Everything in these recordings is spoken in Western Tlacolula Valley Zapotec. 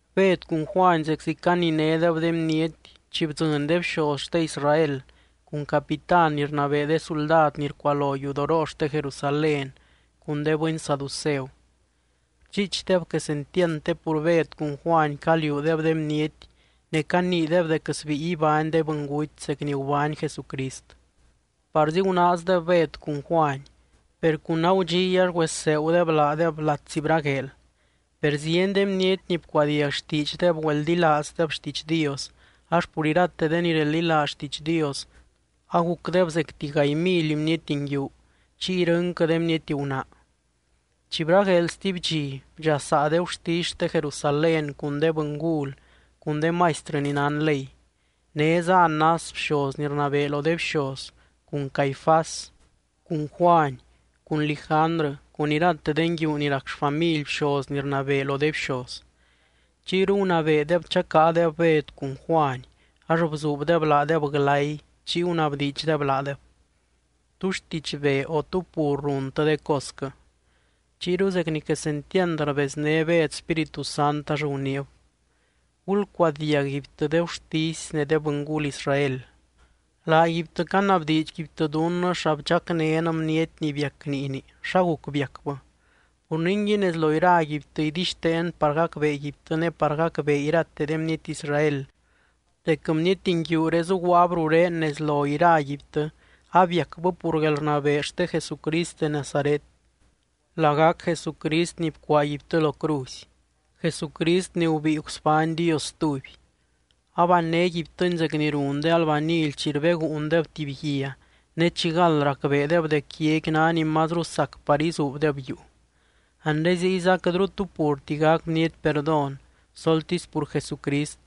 Bed cun Juany zeczi caninédeb de bniety, chi bdzɨny de bxoz xte Israel cun capitán ni rnabee de suldad ni rcualo yudoroo xte Jerusalén, cun de bɨny saduceu. Rdxiichdeb quesentiand te pur Bed cun Juany caliuudeb de bniety, ne caniideb dec sbíi ibány de bɨnguty zec ni gubány Jesucrist. Parzi gunaazdeb Bed cun Juany, per cun agudxiy ax güesegudeb laadeb latsi bragueel. Per zieny de bniety ni bcuadiag xtiidxdeb güeldilaazdeb xtiidx Dios ax pur irate de ni reldilaaz xtiidx Dios, agucdeb zecti gaay mily bniety nguiu, chiy irɨnquɨ de bniety gunaa. Chi bragueel stuby dxi, bdxasaa de gurtisy xte Jerusalén cun de bɨngul cun de maistrɨ ni nán ley. Néza Anás bxoz ni rnabee lo de bxoz, cun Caifás, cun Juany, cun Lijandrɨ cun irate de nguiu ni rac xfamily bxoz ni rnabee lo de bxoz. Chiyru gunabeedeb chacáadeb Bed cun Juany ax bzuubdeb laadeb glay, chiy gunabdiidxdeb laadeb: —¿Tú xtidxbee, o tú pur runtɨ de cosquɨ? Chiyru zec ni quesentiand rbezné Bed Spíritu Sant, ax guniib: —Gulcuadiag guibtɨ de gurtisy ne de bɨngul Israel. Laaguibtɨ canabdiidxguibtɨ dunnɨ xa bdxacnén bniety ni biac niini, xa guc biacbɨ. Pur ningui nez lo iraguibtɨ idixteen par gacbeeguibtɨ ne par gacbee irate de bniety Israel, dec bniety nguiuré zuguaab rurén nez lo iraguibtɨ abiacbɨ pur guelrnabee xte Jesucrist de Nazaret, lagac Jesucrist ni bcuaaguibtɨ lo cruzy, Jesucrist ni gubíi gusbány Dios stuby. Abannéguibtɨny zec ni run de albanily chi rbeguundeb tuby guia, ne chi gald racbeedeb dec guiaqui ná ni mazru sac par izuubdeb yuu. Anre ziyza quɨtru tu purti gac bniety perdón soltisy pur Jesucrist,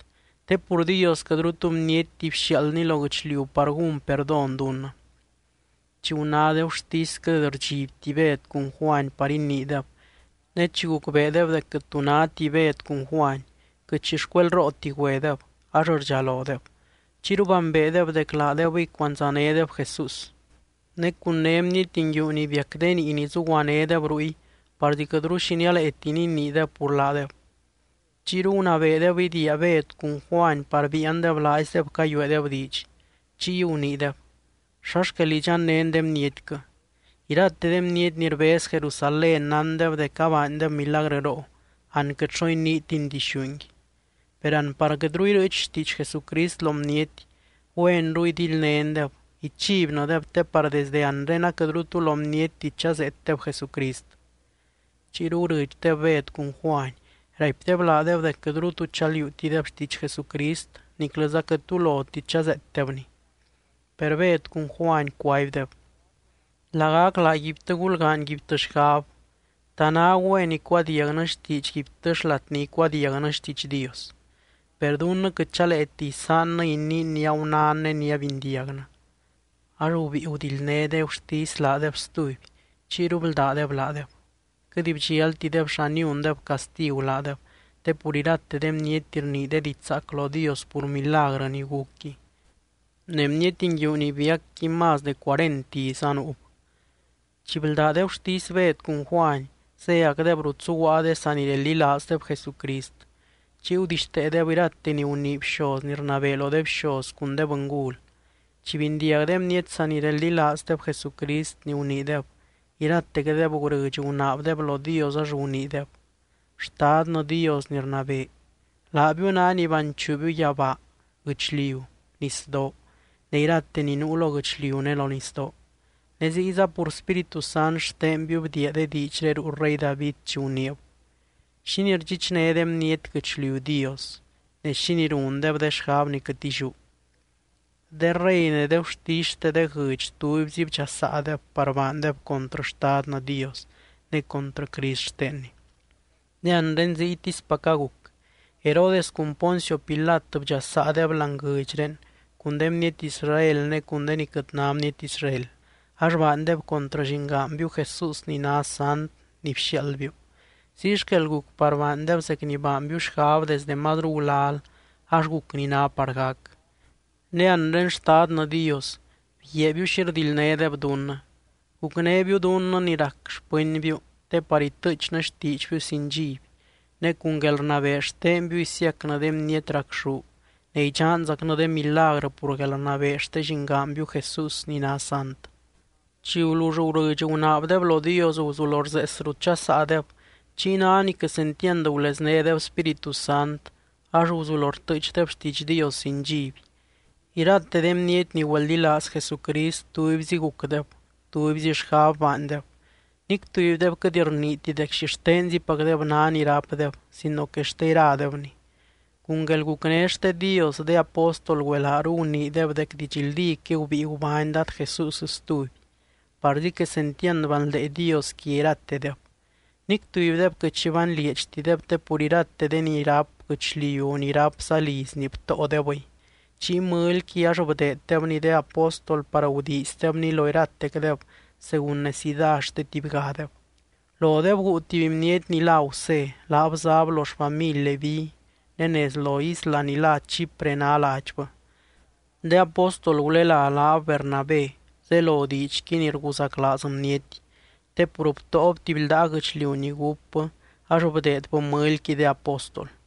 te pur Dios quɨtru tu bnietti bxiaaldny lo guɨchliu par gún perdón dunnɨ. Chi guná de gurtisy quɨt rdxibti Bed cun Juany par iniideb, ne chi gucbeedeb dec quɨt tu náti Bed cun Juany, quɨt xi xcuelrooti güedeb, ax rdxalodeb. Chiyru bambeedeb dec laadebɨy cuandzanédeb Jesús. Ne cun né bniety nguiu ni biac de niini zuguanédeb ruy parzi quɨtru xi nialeeti niniideb pur laadeb. Chiyru gunabeedeb idiia Bed cun Juany par biiandeb laaizdeb cayueedeb diidx. Chiy guniideb: —¿Xa xquel idxannén de bnietquɨ? Irate de bniety ni rbez Jerusalén nándeb dec abaandeb milagrɨroo, an quɨt xo iniitin dixúngui. Per an par quɨtru irɨɨch xtiidx Jesucrist lo bniety, güenru idildnéndeb, ichibnɨdeb te par desde anre aquɨtru tu lo bnietti chazeetdeb Jesucrist. Chiyru gurɨdxdeb Bed cun Juany, raipdeb laadeb dec quɨtru tu chaliuutideb xtiidx Jesucrist niclɨza quɨtru tu loti chazeetdebny. Per Bed cun Juany cuaibdeb: —Lagac laaguibtɨ gulgaanyguibtɨ xgab. ¿Ta ná güen icuadiagnɨ xtiidxguibtɨ xlat ni icuadiagnɨ xtiidx Dios? Per dunnɨ quɨt chaleeti isaannɨ iniin ni agunán ne ni abindiagnɨ. Ax gubíi gudildné de gurtisy laadeb stuby, chiyru bldádeb laadeb. Quɨt bdxiaaltideb xa niundeb castigu laadeb, te pur irate de bniety rnii de diidx zaac lo Dios pur milagrɨ ni gucqui. Ne bniety nguiu ni biacqui más de cuarent iz anuub. Chi bldá de gurtisy Bed cun Juany, zéacdeb rut zuguaa de sanireldilaazdeb Jesucrist. Chiy gudixteedeb irate ni gunii bxoz ni rnabee lo de bxoz cun de bɨngul. Chi bindiag de bniety sanireldilaazdeb Jesucrist ni guniideb, iratecdeb gurɨdx gunaabdeb lo Dios, ax guniideb: —Xtadnɨ Dios ni rnabee, laabiu ná ni banchuubiu yabaa, guɨchliu, nisdoo ne irate ni nuu lo guɨchliu ne lo nisdoo. Ne ziyza pur Spíritu Sant xtenbiu bdiia de diidxré ruu rey David chi guniib: ¿Xínii rdxichné de bniety guɨchliu Dios? Ne, ¿xínii rundeb de xgab ni quɨt illiú? De rey ne de gurtisy xte de guɨdx tubyzi bdxasaadeb par baandeb contrɨ Xtadnɨ Dios ne contrɨ Crist xtenny. ’Ne anre ziytispac aguc, Herodes cun Poncio Pilat bdxasaadeb láani guɨdxré cun de bniety Israel ne cun de ni quɨt ná bniety Israel. Ax baandeb contrɨ llingaanbiu Jesús ni ná sant ni bxiaaldbiu. Ziy xquel guc baandeb zec ni baanbiu xgab desdɨ mazru gulal ax guc ni ná par gac. Ne anre, Xtadnɨ Dios, bguiaabiu xi rdildnédeb dunnɨ. Gucnébiu dunnɨ ni rac xpɨnbiu te par itɨɨchnɨ xtiidxbiu sin dxiby, ne cun guelrnabee xtenbiu isiacnɨ de bniety racxú, ne idxanzacnɨ de milagrɨ pur guelrnabee xte Llingaanbiu Jesús ni ná sant. Chi gulull gurɨdx gunaabdeb lo Dios, guzulo rzees rut dxasaadeb. Chiy ná ni quesentiand guleznédeb Spíritu Sant, ax guzulo rtɨɨchdeb xtiidx Dios sin dxiby. Irate de bniety ni güeldilaaz Jesucrist tubyzi gucdeb, tubyzi xgab baandeb. Nic tubydeb quɨt rniiti dec xixtenzipacdeb ná ni rápdeb sino que xte iradebni. Cun guelgucné xte Dios de apóstol güelaaru guniideb dec didxldíquɨy gubíi gubány Dad Jesús stuby, parzi quesentiand banldee Dios quia iratedeb. Nic tubydeb quɨt xi banlieedxtideb te pur irate de ni ráp guɨchliu, o ni rápza lizni btóodebɨy. Chiy mɨlyqui ax rdeeddebni de apóstol par rguiizdebni lo iratecdeb según necidá xte tubygadeb. Lodeb guu tuby bniety ni lá Gusé, laab záb lo xfamily Leví, ne nez lo isla ni lá Chipre ná ladxbɨ. De apóstol gulelá laab Bernabé (zelo diidxqui, ni rguzaclaaz bniety). Te pur btóob tuby ldaa guɨchliu ni gúpbɨ, ax bdeedbɨ mɨlyqui de apóstol.